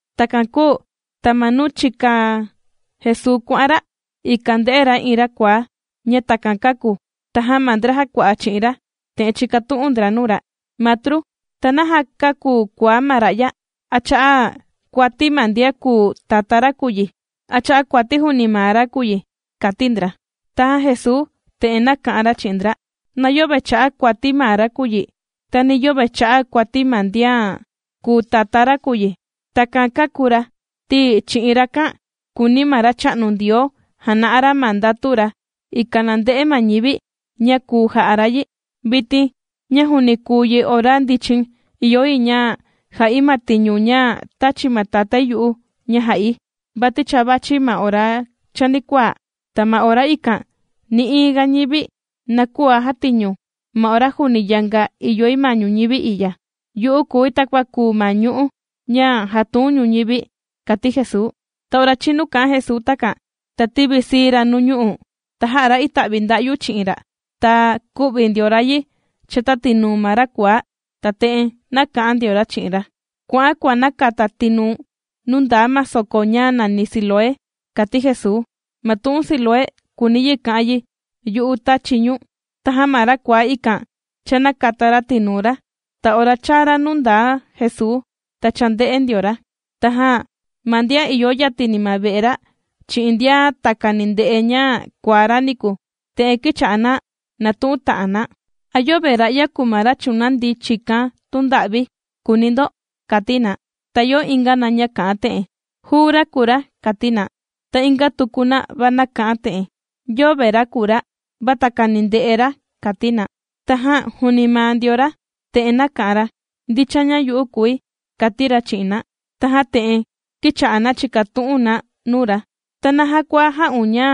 Takan kūu ta ma nuu chìka Jesuu kuà'an ra, ikan ndē'e ra iin ra kuaá ña takan kāku. Tajan ma ndra jàkua'a chi'in ra, te'en chīkatu'un ndra nuu ra: ―Matru, ¿ta naja kāku kuaá ma ra'ya? ¿A cha'a' kuati ma ndian kùu tatá ra kùu yi, a cha'a kuati juuni maa ra kùu yi? ―kàti ndra. Tajan Jesuu te'en nāka'an ra chi'in ndra: ―Na yöve cha'a' kuati maa ra kùu yi, ta ni yöve cha'a' kuati ma ndian kùu tatá ra kùu yi. Takan kāku ra, ti chi'in rakan kùuni ma Racha'nu Ndioo jana'a ra ma ndatu ra, ikan na nde'e ma ñivi, ña kùu ja'a ra yi. Vitin ña juuni kùu yi ora ndichin, ìyo yi ña ja'i ma tiñu ña tāchi ma Tatái yu'u ña jà'i. Vati cha vàchi ma ora chanikuaa, ta ma ora ikan nï'iin ga ñivi, na küa jatiñu. Ma ora juuni yanga ìyoi ma ñuñivi i'ya, yu'u kùi takua kùu ma ñu'ú, ña jàtuun ñuñivi ―kàti Jesuu. Ta ora chīnu kā'an Jesuu takan, ta tīvisii ra nuu ñu'u', ta jā'a ra ita'vi nda'yu chi'in ra', ta kū'vi ndio ra yi chata tinuu ma ra kuaá. Ta te'en nāka'an ndio ra chi'in ra: ―¡Kua'an, kuànakata tinuu̱n, nuu ndaa ma soko ña nàni Siloé! ―kàti Jesuu. Ma tu'un Siloé, kùuni yi ka'an yi: Yu'u tàchi ñu̱n. Tajan ma ra kuaá ikan cha nākata ra tinuu ra, ta ora chāa ra nuu ndaa Jesuu, ta cha ndè'e ndio ra. Tajan ma ndian ìyo yatini ma ve'e ra, chi'in ndian takani ndè'e ña kuaá ra niku, te'en kīcha'a na nàtu'un ta'an na: ―¿A yöve ra'ya kùu ma ra chùnandi chìkan tunda'vi?, kùuni ndo ―kàti na. Ta ìyo inga na ña kà'an te'en: ―Juu ra kùu ra ―kàti na. Ta inga tuku na va kà'an te'en: ―Yöve ra kùu ra, va takani ndè'e ra ―kàti na. Tajan juuni maa ndio ra, te'en nāka'an ra: ―Ndicha ña yu'u kùi ―kàti ra chi'in na. Tajan te'en kīcha'a na chìkatu'un na nuu ra: ―¿Ta naja kua jā'un ña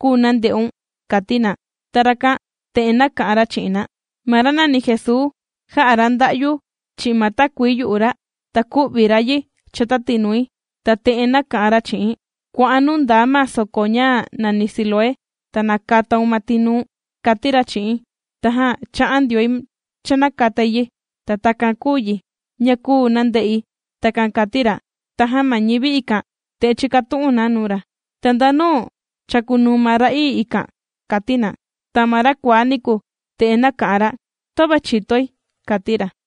kūu nande'un? ―kàti na. Ta rakan te'en nāka'an ra chi'in na: ―Ma ra nàni Jesuu, jā'a ra nda'yu chi'in ma takuii yu'u ra, ta kū'vi ra yi chata tinui, ta te'en nāka'an ra chi'i̱n: “Kua'an nuu ndaa ma soko ña nàni Siloé, ta nakataun ma tinuu̱n”, kāti ra chi'i̱n. Tajan chā'an ndioi cha nākatai yi. Ta takan kūu yi, ña kūu nande'i ―Takan kàti ra. Tajan ma ñivi ikan, te'en chīkatu'un na nuu ra: ―¿Ta ndanu chàkunuu ma ra'ii ikan? ―kàti na. Ta ma ra kuaá niku, te'en nāka'an ra: ―Töve chìtoi ―kàti ra.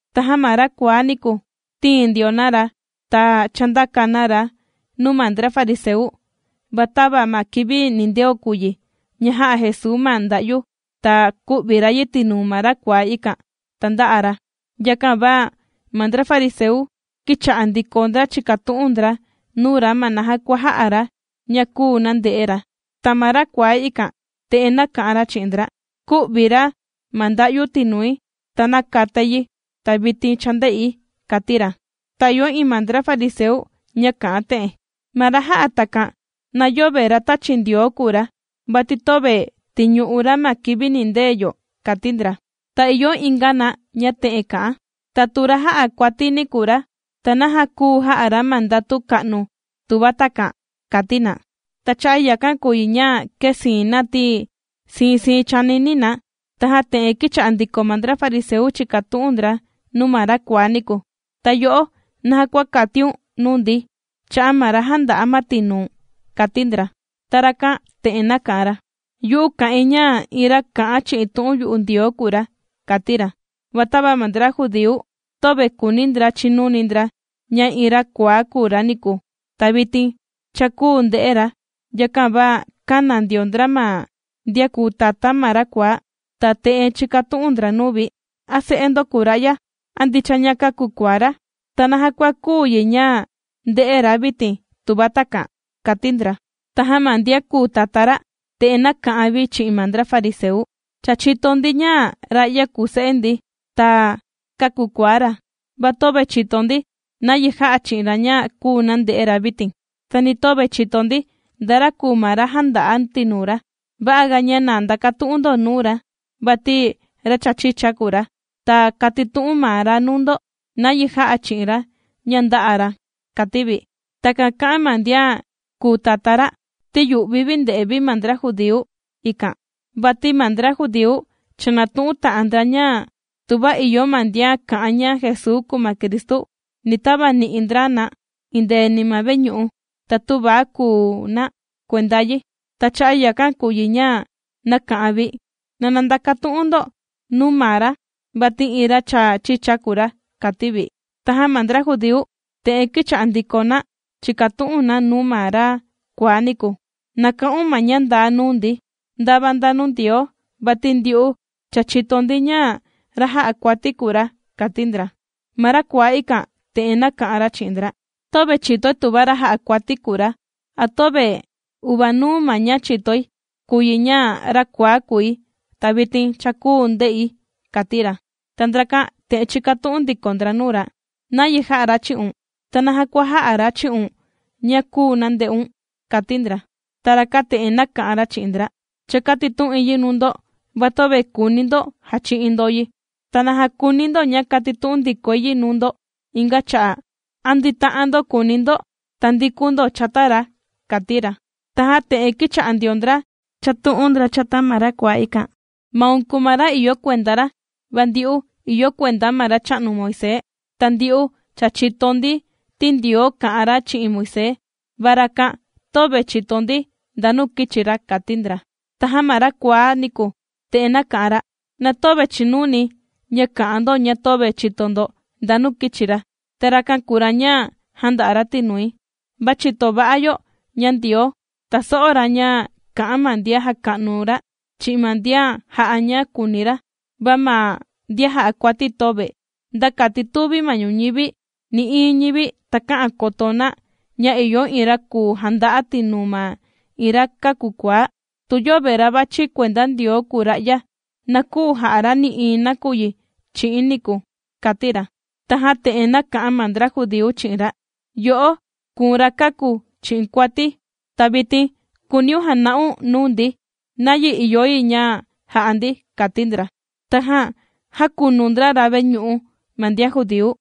Tajan ma ra kuaá niku, tīin ndio na ra, ta chāndaka na ra nuu ma ndra fariseu. Va tava ma kivi nindeo kùu yi ña jā'a Jesuu ma nda'yu, ta kū'vi ra yi tinuu ma ra kuaá ikan, ta ndā'a ra. Yakan va ma ndra fariseu kīcha'a ndiko ndra chìkatu'un ndra nuu ra ma naja kua jā'a ra ña kūu nande'e ra. Ta ma ra kuaá ikan te'en nāka'an ra chi'in ndra: ―Kū'vi ra ma nda'yu tinui, ta nākatai yi, ta vitin cha ndè'i ―kàti ra. Ta ìyo iin ma ndra fariseu ña kà'an te'en: ―Ma ra jà'a takan, na yöve ra tāchi Ndioo kùu ra, vati töve tìñu'u ra ma kivi nìndee yo ―kàti ndra. Ta ìyo inga na ña te'en kà'an: ―Ta tu ra jà'a kuatini kùu ra, ¿ta naja kùu jà'a ra ma ndatu ka'nu tuva takan? ―kàti na. Ta cha'a' yakan kùu yi ña kēsiin na ti, siin siin chànini na. Tajan te'en kīcha'a ndiko ma ndra fariseu chìkatu'un ndra nuu ma ra kuaá niku: ―Ta yo'o, ¿naja kua kàtiun nuu ndi, cha'a' ma ra jānda'a ma tinuu̱n? ―kàti ndra. Ta rakan te'en nāka'an ra: ―Yu'u kà'in, ña iin ra kà'an chi'in tu'un yu'u Ndioo kùu ra ―kàti ra. Va tava ma ndra judíu, töve kùuni ndra chinuni ndra ña iin ra kuaá kūu ra niku, ta vitin cha kùu nde'e ra, yakan va kāna ndio ndra ma ndian kùu tatá ma ra kuaá, ta te'en chīkatu'un ndra nuu vi: ―¿A se'e ndo kùu ra'ya? ¿A ndicha ña kāku kuaá ra? ¿Ta naja kua kùu yi ña ndè'e ra vitin tuva takan? ―kàti ndra. Tajan ma ndian kùu tatá ra, te'en nāka'an vi chi'in ma ndra fariseu: ―Cha chìto ndi, ña ra'ya kùu se'e ndi, ta kāku kuaá ra, va töve chìto ndi nayi jā'a chi'in ra ña kūu nande'e ra vitin, ta ni töve chìto ndi, nda ra kùu ma ra jānda'a tinuu ra. Va'aga, ña na ndakatu'un ndo nuu ra, vati ra cha chicha kùu ra, ta kàtitu'un maa ra nuu ndo nayi jā'a chi'in ra ña ndā'a ra ―kàti vi. Takan kā'an ma ndian kùu tatá ra, ti yu'vi vi ndè'e vi ma ndra judíu ikan, vati ma ndra judíu cha natu'un ta'an ndra, ña tuva ìyo ma ndian kà'an ña Jesuu kùu ma Cristu, ni tavani'i ndra na indeeni ma veñu'u, ta tüva kùu na kuenda yi. Ta cha'a' yakan kùu yi ña nāka'an vi: “Na ndakatu'un ndo nuu maa ra, vati iin ra cha chicha kùu ra”, kāti vi. Tajan ma ndra judíu, te'en kīcha'a ndiko na chìkatu'un na nuu ma ra kuaá niku: ―Na ka'un ma ña ndaa nuu ndi, ndava nda nuu Ndioo, vati ndyu'u cha chìto ndi ña, ra jà'a kuati kùu ra ―kàti ndra. Ta ma ra kuaá ikan, te'en nāka'an ra chi'in ndra: ―Töve chìtoi tuva ra jà'a kuati kùu ra, a töve. Uvanuu ma ña chìtoi kùu yi ña, ra kuaá kūi, ta vitin, cha kùu nde'i ―kàti ra. Ta ndrakan te'en chīkatu'un ndiko ndra nuu ra: ―¿Nayi jā'a ra chi'un? ¿Ta naja kua jā'a ra chi'un ña kūu nande'un? ―kàti ndra. Ta rakan te'en nāka'an ra chi'in ndra: ―Cha kātitu'in yi nuu ndo, va töve kùuni ndo jachi'in ndo yi. ¿Ta naja kùuni ndo ña kàtitu'un ndikoi yi nuu ndo inga cha'a'? ¿A ndita'an ndo kùuni ndo tandikun ndo chata ra? ―kàti ra. Tajan te'en kīcha'a ndio ndra chàtu'un ndra chata ma ra kuaá ikan: ―Maun kùu ma ra ìyo kuenda ra, va ndyu'u, ìyo kuenda ma racha'nu Moisés. Ta ndyu'u cha chìto ndi, ti Ndioo kā'an ra chi'in Moisés, va rakan, töve chìto ndi ndanu kīchi ra ―kàti ndra. Tajan ma ra kuaá niku, te'en nāka'an ra: ―Na töve chìnuni̱ ña kà'an ndo ña töve chìto ndo ndanu kīchi ra, ta rakan kùu ra ña jānda'a ra tinui. Cha chìto va'a yo ña Ndioo, tàso'o ra ña kà'an ma ndian jàka'nu ra, chi'in ma ndian jà'a ña kùuni ra, va ma ndian jà'a kuati, töve. Nda kati tūvi ma ñuñivi nï'iin ñivi takä'an koto na ña ìyo iin ra kùu janda'a tinuu ma iin ra kāku kuaá. Tu yöve ra vàchi kuenda Ndioo kùu ra'ya, na küu ja'a ra nï'iin nakuyi chi'i̱n niku ―kàti ra. Tajan te'en nāka'an ma ndra judíu chi'in ra: ―Yo'o, kùu̱n ra kāku chi'in kuati, ¿ta vitin kùuniun jana'un nuu ndi nayi ìyo yi ña ja'a ndi? ―kàti ndra. Tajan jākunu ndra ra veñu'u ma ndian judíu.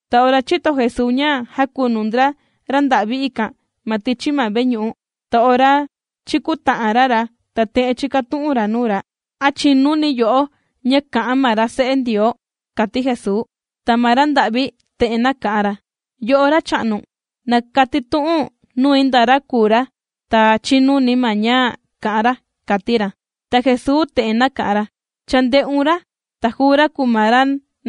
Ta ora chīto Jesuu ña jākunu ndra ra nda'vi ikan ma tichi ma veñu'u, ta ora chīkuta'an ra ra, ta te'en chīkatu'un ra nuu ra: ―¿A chìnuni yo'o ña kà'an ma ra Se'e Ndioo? ―kàti Jesuu. Ta ma ra nda'vi te'en nāka'an ra: ―Yo'o racha'nu, na katitu'u̱n nui nda ra kùu ra, ta chinuni̱ ma ña kà'an ra ―kàti ra. Ta Jesuu te'en nāka'an ra: ―Cha ndē'un ra, ta juu ra kùu ma ra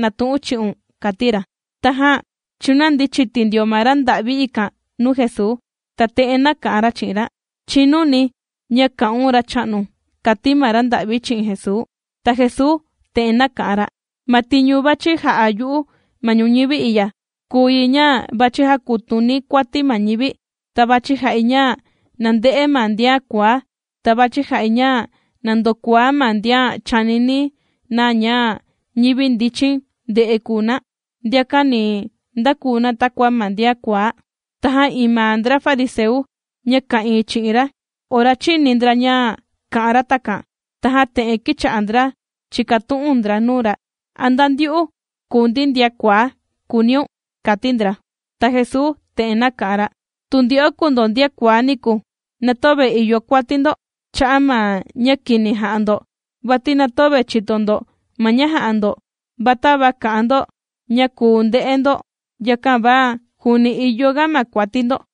nàtu'un chi'un ―kàti ra. Tajan chūnandi chiti ndio ma ra nda'vi ikan nuu Jesuu, ta te'en nāka'an ra chi'in ra: ―Chìnuni̱ ña kà'un Racha'nu ―kàti ma ra nda'vi chi'in Jesuu. Ta Jesuu te'en nāka'an ra: ―Ma tiñu vàchi ja'a yu'u ma ñuñivi i'ya, kùu yi ña vàchi jakutuni̱ kuati ma ñivi. Ta vàchi ja'i ña nande'e ma ndian kuaá. Ta vàchi ja'i ña na ndokuaá ma ndian chànini na ña ñivi ndichin nde'e kùu na. Ndiakan ni ndakuu na takua ma ndian kuaá. Tajan iin ma ndra fariseu, ña ka'ìin chi'in ra, ora chīni ndra ña kā'an ra takan, tajan te'en kīcha'a ndra chìkatu'un ndra nuu ra: ―¿A nda ndyu'u kùu ndi ndian kuaá?, kùuniun ―kàti ndra. Ta Jesuu te'en nāka'an ra: ―Tu ndyo'o kùu ndo ndian kuaá niku, na töve ìyo kuati ndo cha'a' ma ña kini jà'a ndo, vati na töve chìto ndo ma ña jà'a ndo. Va tava kà'an ndo ña kùu nde'e ndo, yakan va juuni ìyo ga ma kuati ndo.